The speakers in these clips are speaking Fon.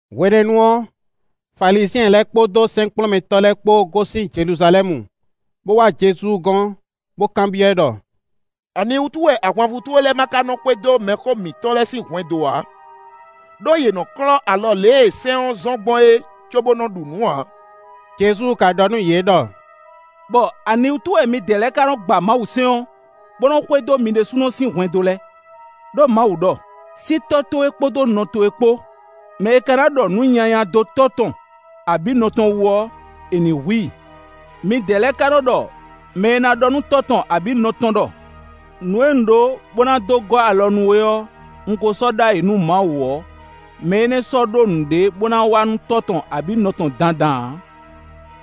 Hwenɛ́nu ɔ́, Falizyɛn lɛ́ɛ kpódó sɛ́nkplɔ́nmɛtɔ́ lɛ́ɛ kpó gosín Jeluzalɛ́mu, bó wá Jezu gɔ́n, bó kanbyɔ́ ɛ ɖɔ: “Aniwútu wɛ ahwanvú towe lɛ́ɛ ma ka nɔ́ xwedó mɛxó mitɔn lɛ́ɛ sín hwɛndo ǎ? Ɖó yě nɔ klɔ́ alɔ lě e sɛ́n ɔ́ zɔ́n gbɔn é cóbó nɔ ɖu nǔ ǎ.” Jezu ka ɖɔ nú yě ɖɔ: “Bɔ aniwútu wɛ midɛɛ lɛ́ɛ ka nɔ gba Mawusɛ́n ɔ́, bó nɔ́ xwedó mi ɖésúnɔ sín hwɛndo lɛ́ɛ? Ɖó Mawu ɖɔ: ‘Sí tɔ́ towe kpódó nɔ towe kpó; mɛ e ka na ɖɔ nǔ nyanya dó tɔ́ tɔn abǐ nɔ tɔn wú ɔ́, è ní hu i.’ Midɛɛ lɛ́ɛ ka nɔ́ ɖɔ mɛ e ná ɖɔ nú tɔ́ tɔn abǐ nɔ tɔn ɖɔ: ‘Nǔ e un ɖó bo na dó gɔ́ alɔ nú we ɔ́, un ko sɔ́ ɖó ayǐ nú Mawu’ ɔ́, mɛ énɛ́ ɔ́ sɔ́ ɖó nǔɖé bó ná wa nú tɔ́ tɔn abǐ nɔ tɔn dandan ǎ.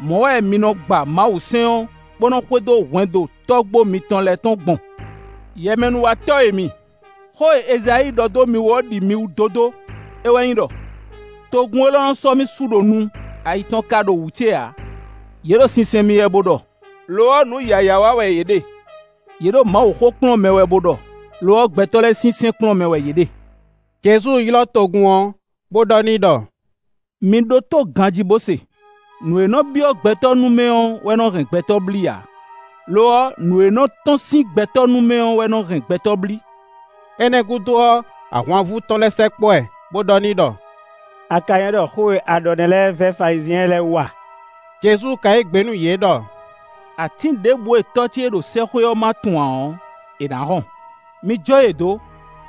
Mɔ̌ wɛ mi nɔ gba Mawusɛ́n ɔ́, bó nɔ́ xwedó hwɛndo tɔ́gbó mitɔn lɛ́ɛ tɔn gbɔn. Yɛmɛnúwatɔ́ e mi! Xó e Ezayíi ɖɔ dó mi wú ɔ́ ɖi mi wú dódó. É wɛ nyí ɖɔ: ‘Togun élɔ́ nɔ sɔ́ mì su ɖo nu; ayi tɔn ka ɖo wǔ ce ǎ. Yě ɖo sinsɛn mì wɛ bo ɖɔ; lo ɔ́, nǔ yǎyá wa wɛ yě ɖe; yě ɖo Mawuxó kplɔ́n mɛ wɛ bo ɖɔ; lo ɔ́, gbɛtɔ́ lɛ́ɛ sín sɛ́n kplɔ́n mɛ wɛ yě ɖe.’” Jezu ylɔ́ togun ɔ́, bo ɖɔ n'i ɖɔ: “Mi ɖótó ganjí, bo se; nǔ e nɔ byɔ́ gbɛtɔ́ nu mɛ ɔ́ wɛ nɔ hɛn gbɛtɔ́ blí ǎ; lo ɔ́, nǔ e nɔ tɔ́n sín gbɛtɔ́ nu mɛ ɔ́ wɛ nɔ hɛn gbɛtɔ́ blí.” Énɛ́ gúdo ɔ́, ahwanvú tɔn lɛ́ɛ sɛkpɔ́ ɛ, bo ɖɔ n'i ɖɔ: “A ka nywɛ́ ɖɔ xó e a ɖɔ nɛ́ lɛ́ɛ vɛ́ Falizyɛn lɛ́ɛ wú a?” Jezu ka yí gbe nú yě ɖɔ: “Atín ɖěbǔ e tɔ́ ce e ɖo sɛ́xwé ɔ́ ma tun ǎ ɔ́, è nǎ hɔn. Mi jó yě dó;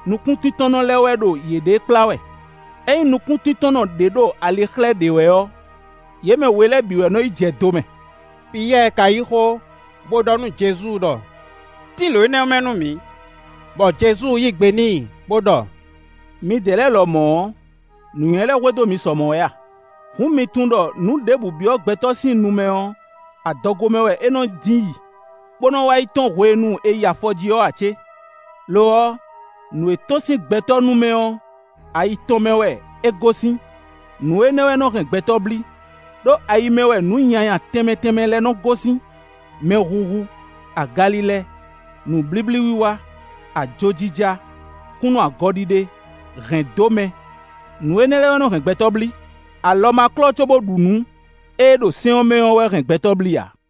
nukúntíntɔ́nnɔ lɛ́ɛ wɛ ɖo yěɖée kplá wɛ; ényí nukúntíntɔ́nnɔ ɖě ɖo ali xlɛ́ ɖě wɛ ɔ́, yě mɛ we lɛ́ɛ bǐ wɛ nɔ yi jɛ do mɛ.” Piyɛ́ɛ ka yí xó, bó ɖɔ nú Jezu ɖɔ: “Tín lǒ énɛ́ mɛ nú mǐ.” Bɔ Jezu yí gbe n'i bo ɖɔ: “Midɛɛ lɛ́ɛ lɔmɔ̌ ɔ́, nǔnywɛ́ lɛ́ hwedó mi sɔ mɔ̌ wɛ a? Hǔn, mi tunwun ɖɔ nǔ ɖěbǔ byɔ́ gbɛtɔ́ sín nu mɛ ɔ́, adɔgo mɛ wɛ é nɔ dín yi, bó nɔ́ wá yi tɔ́n hwenu e è yi afɔjí ɔ́ ǎ cé? Lo ɔ́, nǔ e tɔ́n sín gbɛtɔ́ nu mɛ ɔ́, ayi tɔn mɛ wɛ é gosín; nǔ énɛ́ wɛ nɔ́ hɛn gbɛtɔ́ blí; ɖó ayi mɛ wɛ nǔ nyanya tɛnmɛ tɛnmɛ lɛ́ɛ nɔ́ gosín: mɛhuhu, agalilɛ, nǔblíblí wiwa, ajojija, kúnnu agɔ ɖiɖe, hɛ̌ndómɛ. Nǔ énɛ́ lɛ́ɛ wɛ nɔ́ hɛn gbɛtɔ́ blí. Alɔ ma klɔ́, cóbó ɖu nǔ e ɖo sɛ́n ɔ́ mɛ ɔ́ wɛ nɔ́ hɛn gbɛtɔ́ blí ǎ.”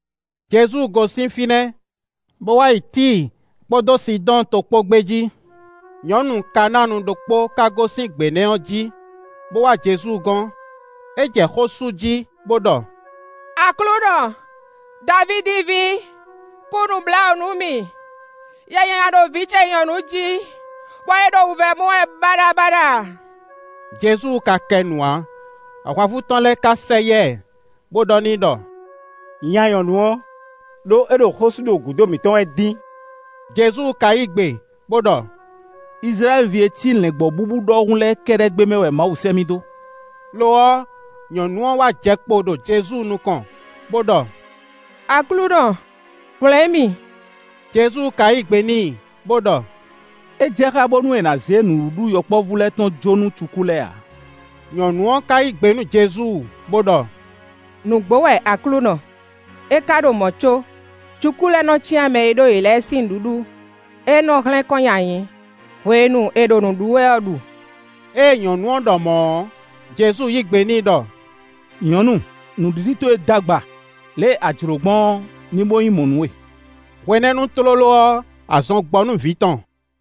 Jezu gosín fínɛ́, bo wá yi Tíi kpódó Sidɔ́ɔn to kpó gbé jí. Nyɔ̌nu Kanáanu ɖokpó ka gosín gbě nɛ́ ɔ́ jí, bó wá Jezu gɔ́n. É jɛ xó sú jí, bó ɖɔ: “Aklúnɔ! Davídi ví, kú nǔbláwǔ nú mì. Yɛ nyanya ɖo vǐ ce nyɔ̌nu jí, bɔ é ɖo wǔvɛ́ mɔ wɛ baɖabaɖa.” Jezu ka kɛ nu ǎ. Ahwanvú tɔn lɛ́ɛ ka sɛ yá ɛ, bó ɖɔ n'i ɖɔ: “Nya nyɔ̌nu ɔ́, ɖó é ɖo xó sú ɖo gǔdo mǐtɔn wɛ dín.” Jezu ka yí gbe bo ɖɔ: “Izlayɛ́li ví e ci lɛ̌ngbɔ́ búbú ɖɔhun lɛ́ɛ kɛ́ɖɛ́ gbé mɛ wɛ Mawu sɛ́ mì dó.” Lo ɔ́, nyɔ̌nu ɔ́ wá jɛ kpo ɖo Jezu nukɔn, bó ɖɔ: “Aklúnɔ, hwlɛ̌n mì!” Jezu ka yí gbe n'i bó ɖɔ: “É jɛ xá bónú è nǎ zé nǔɖuɖu yɔkpɔ́vú lɛ́ɛ tɔn jó nú cukú lɛ́ɛ ǎ.” Nyɔ̌nu ɔ́ ka yí gbe nú Jezu bó ɖɔ: “Nǔgbó wɛ Aklúnɔ; é ka ɖo mɔ̌ có cukú lɛ́ɛ nɔ́ cyán mɛ e ɖó yě lɛ́ɛ sín nǔɖuɖu e nɔ́ hlɛ́n kɔn nyi ayǐ hwenu e è ɖo nǔ ɖu wɛ ɔ́ ɖu.” Ée nyɔ̌nu ɔ́ ɖɔ mɔ̌ ɔ́, Jezu yí gbe n'i ɖɔ: “Nyɔ̌nu, nǔɖiɖi towe d'agba; lě e a jlǒ gbɔn ɔ́, ní bó nyí mɔ̌ nú we.” Hwenɛ́nu tlóló ɔ́, azɔn gbɔ nú vǐ tɔn.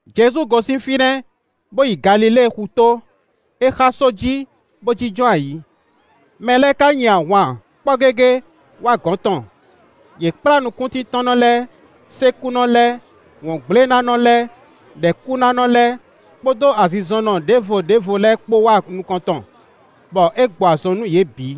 Jezu gosín fínɛ́, bó yi Galilée xutó. É xá só jí, bó jínjɔ́n ayǐ. Mɛ lɛ́ɛ ka nyi ahwan kpɔ́ gégé wá gɔ̌n tɔn. Yě kplá nukúntíntɔ́nnɔ lɛ́ɛ, sékúnɔ lɛ́ɛ, wɔ̌ngblénánɔ lɛ́ɛ, ɖɛ̌kúnánɔ lɛ́ɛ, kpódó azinzɔnnɔ ɖěvo ɖěvo lɛ́ɛ kpó wá nukɔn tɔn, bɔ é gbɔ azɔn nú yě bǐ.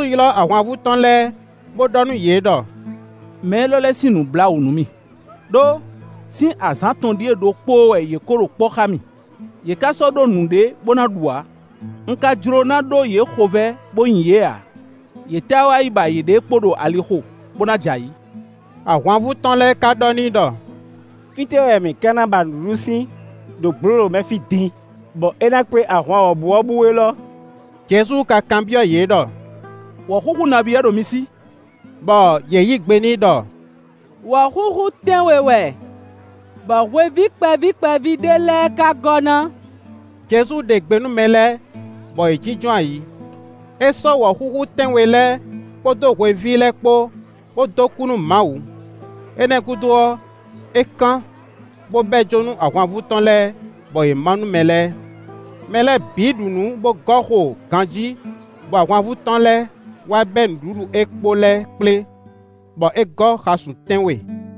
Jezu ylɔ́ ahwanvú tɔn lɛ́ɛ, bó ɖɔ nú yě ɖɔ: “Mɛ élɔ́ lɛ́ɛ sín nǔ blá wǔ nú mì, ɖó, sín azǎn atɔn ɖíe ɖokpóó wɛ yě ko ɖo kpɔ́ xá mì; yě ká sɔ́ ɖó nǔɖé bó ná ɖu ǎ. Un ka jló ná ɖó yě xovɛ́ bó nyi yě ǎ; yě táá wá yi ba yěɖée kpo ɖo alixo, bó ná jɛ ayǐ.” Ahwanvú tɔn lɛ́ɛ ka ɖɔ n'i ɖɔ: “Fítɛ́ wɛ mǐ ka ná ba nǔɖuɖu sín ɖo gblǒlǒ mɛ fí din, bɔ é ná kpé ahwan wɔ̌buwɔ́bú élɔ́?” Jezu ka kanbyɔ́ yě ɖɔ: “Wɔ̌xúxú nabí wɛ ɖo mi sí?” Bɔ yě yí gbe n'i ɖɔ: “Wɔ̌xúxú tɛ́nwe wɛ, bɔ hweví kpɛví kpɛví ɖé lɛ́ɛ ka gɔ́ ná.” Jezu ɖe gbe nú mɛ lɛ́ɛ, bɔ yě jínjɔ́n ayǐ. É sɔ́ wɔ̌xúxú tɛ́nwe lɛ́ɛ kpódó hweví lɛ́ɛ kpó, bó dó kú nú Mawu. Énɛ́ gúdo ɔ́, é kán, bó bɛ́ jó nú ahwanvú tɔn lɛ́ɛ, bɔ yě má nú mɛ lɛ́ɛ. Mɛ lɛ́ɛ bǐ ɖu nǔ bó gɔ́ xo ganjí, bɔ ahwanvú tɔn lɛ́ɛ wá bɛ́ nǔɖuɖu e kpo lɛ́ɛ kplé, bɔ é gɔ́ xasun tɛ́nwe.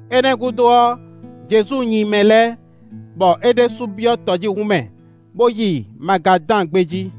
Énɛ́ gúdo ɔ́, Jezu nyi mɛ lɛ́ɛ, bɔ é ɖésú byɔ́ tɔjíhún mɛ, bó yi Magadán gbé jí.